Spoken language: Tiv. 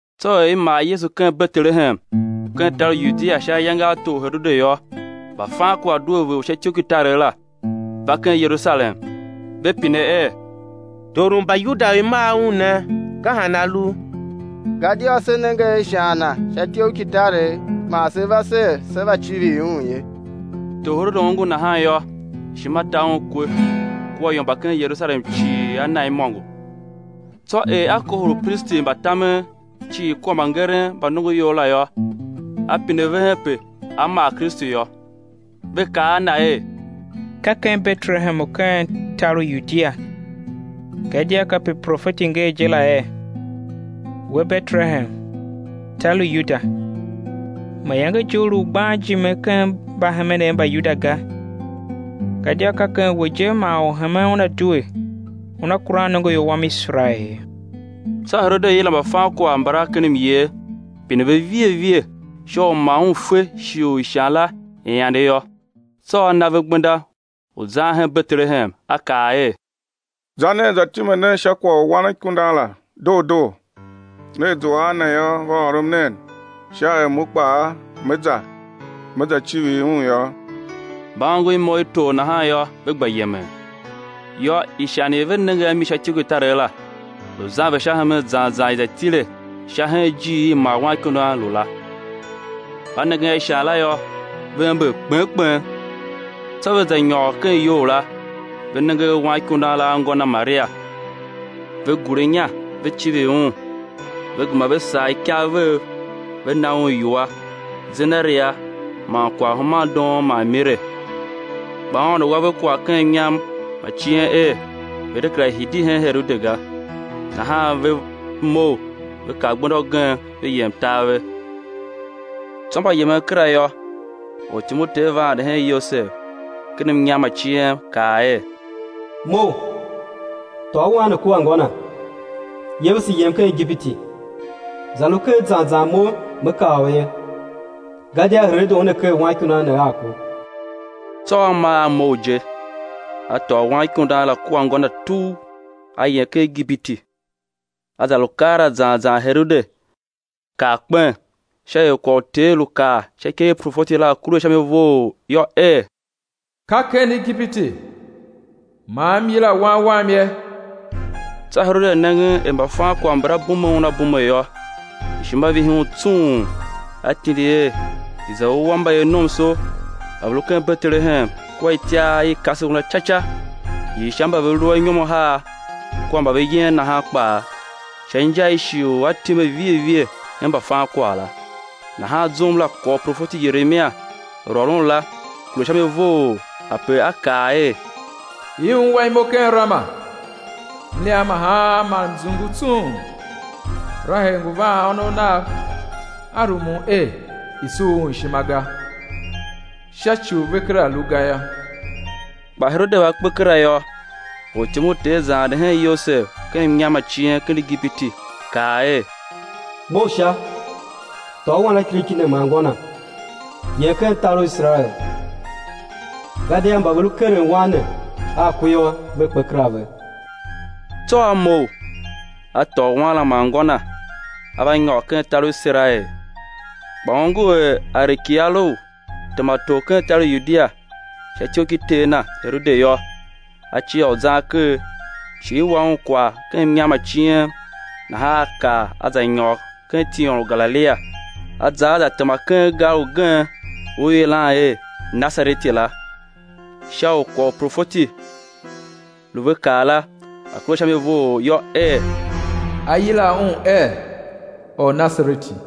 Tsô er i mar Yesu ken Betelehem u ken tar u Yudia sha ayange a tor Herode yô, mbafankwagh due vegher u sha ityoughkitaregh la, va ken Yerusalem, ve pine er: Tor u Mbayuda u i mar Un ne, ka han A lu? Gadia se nenge ishan Na sha ityoughkitaregh, man se ve ser, sé va civir Un ye. Tor Herode ongo nahan yô, ishima ta un kwe, kua ior mba ken Yerusalem cii a na imôngo. Tsô er a kohol upristi mba tamen cii kua mbangeren mba nongoior la yô, a pine ve hen ape á mar Kristu yô. Ve kaa a na er: Ka ken Betelehem u ken tar u Yudia, gadia kape profeti nger je la er: We, Betelehem, tar u Yuda, mayange je u lu u gban ijime ken mbahemenev mba Yuda ga; gadia ka ken we je man Orhemen Una due, u Una kuran nongoior Wan Iserael ye. Tsô Herode yila mbafankwagh mbala ken myer pine ve vighe vighe sha u ma un fe shighe u ishan la i ande yô. Tsô a na ve gbenda u zan hen Betelehem, a kaa er: Za nen za time nen sha kwagh u Wanikundan la doo doo; nea zua a Na yô, va ôrom nen, sha er mo kpaa me za, me za civir Un yô. Mba ongo imo i tor nahan yô, ve gba yemen. Yô, ishan i ve nenge a mi sha ityoughkitaregh la, lu zan ve sha hemen zan zan i za tile sha hen ijir i Wanikundan la lu la. Mba nengen a ishan la yô, ve ember kpen kpen. Tsô ve za nyôr ken iyou la, ve nenge a Wanikundan la a ngô Na Maria, ve gure inya ve civir Un, ve gema ve sagh ikav vev, ve na Un iwua: zenaria man kwaghhumandoon man mire. Kpa Aôndo wa ve kwagh ken mnyam ma cien er, ve̱ de kera hidi hen Herode ga, nahan ve mough, ve kar gbenda ugen, ve yem tar ve. Tsô mba yemen kera yô, ortyom u Ter va ande hen Yosev ken mnyam ma ciem, kaa er: Mough, tôô Wan ne kua ngô Na, yevese yem ken Igipiti, za lu ker zan zan Mo man Me kaa u ye; gadia Herode una ker Wanikundan ne a ku. Tsô a maa a mough je, a tôô Wanikundan la kua ngô Na tugh, a yem ken Igipiti; a za lu keela zan zan Herode kar kpen, sha er kwagh u Ter lu kaa sha ikev i profeti la a̱ kure sha mi vough yô, er: Ka ken Igipiti man M yila Wan Wam ye. Tsô Herode nengen er mbafankwagh mbala bume un a bume yô, ishima vihi un tsung, a tindi er, i̱ za wua mbayevnomso mba ve lu ken Betelehem kua ken ityar i i kase un la ca ca, hii sha mba ve lu anyom ahar kua mba ve yen nahan kpaa, sha inja i shighe u a time vighe vighe hen mbafankwagh la. Nahan zum la kwagh u profeti Yeremia lu ôron la, kure sha mi vough, ape a kaa er: I ungwa imo ken Rama, mliam ma haan man mzungu tsung! Rahel ngu vaan ônov nav, a rumun er i̱ sur un ishima ga, sha ci u ve kera lu ga yô. Kpa Herode va kpe kera yô, ortyom u Ter za ande hen Yosev ken mnyam ma cien ken Igipiti, kaa er: Mough sha, tôô Wanakiriki ne man ngô Na, yem ken tar u Iserael gadia mba ve lu keren Wan ne a ku yô, ve kpe kera ve. Tsô a mough, a tôô Wan la man ngô na, a va nyôr ken tar u Iserael. Kpa ongo er Arekilau tema tor ken tar u Yudia sha ityough ki ter na, Herode yô, a cia u zan ker; shi i wa un kwagh ken mnyam ma cien, nahan a kar a za nyôr ken tiôn u Galilia, a za a za tema ken gar ugen u i yilan er Nasareti la, sha u kwagh u uprofeti lu ve kaa la, a̱ kure sha mi vough yô, er: Á yila Un er Ornasareti.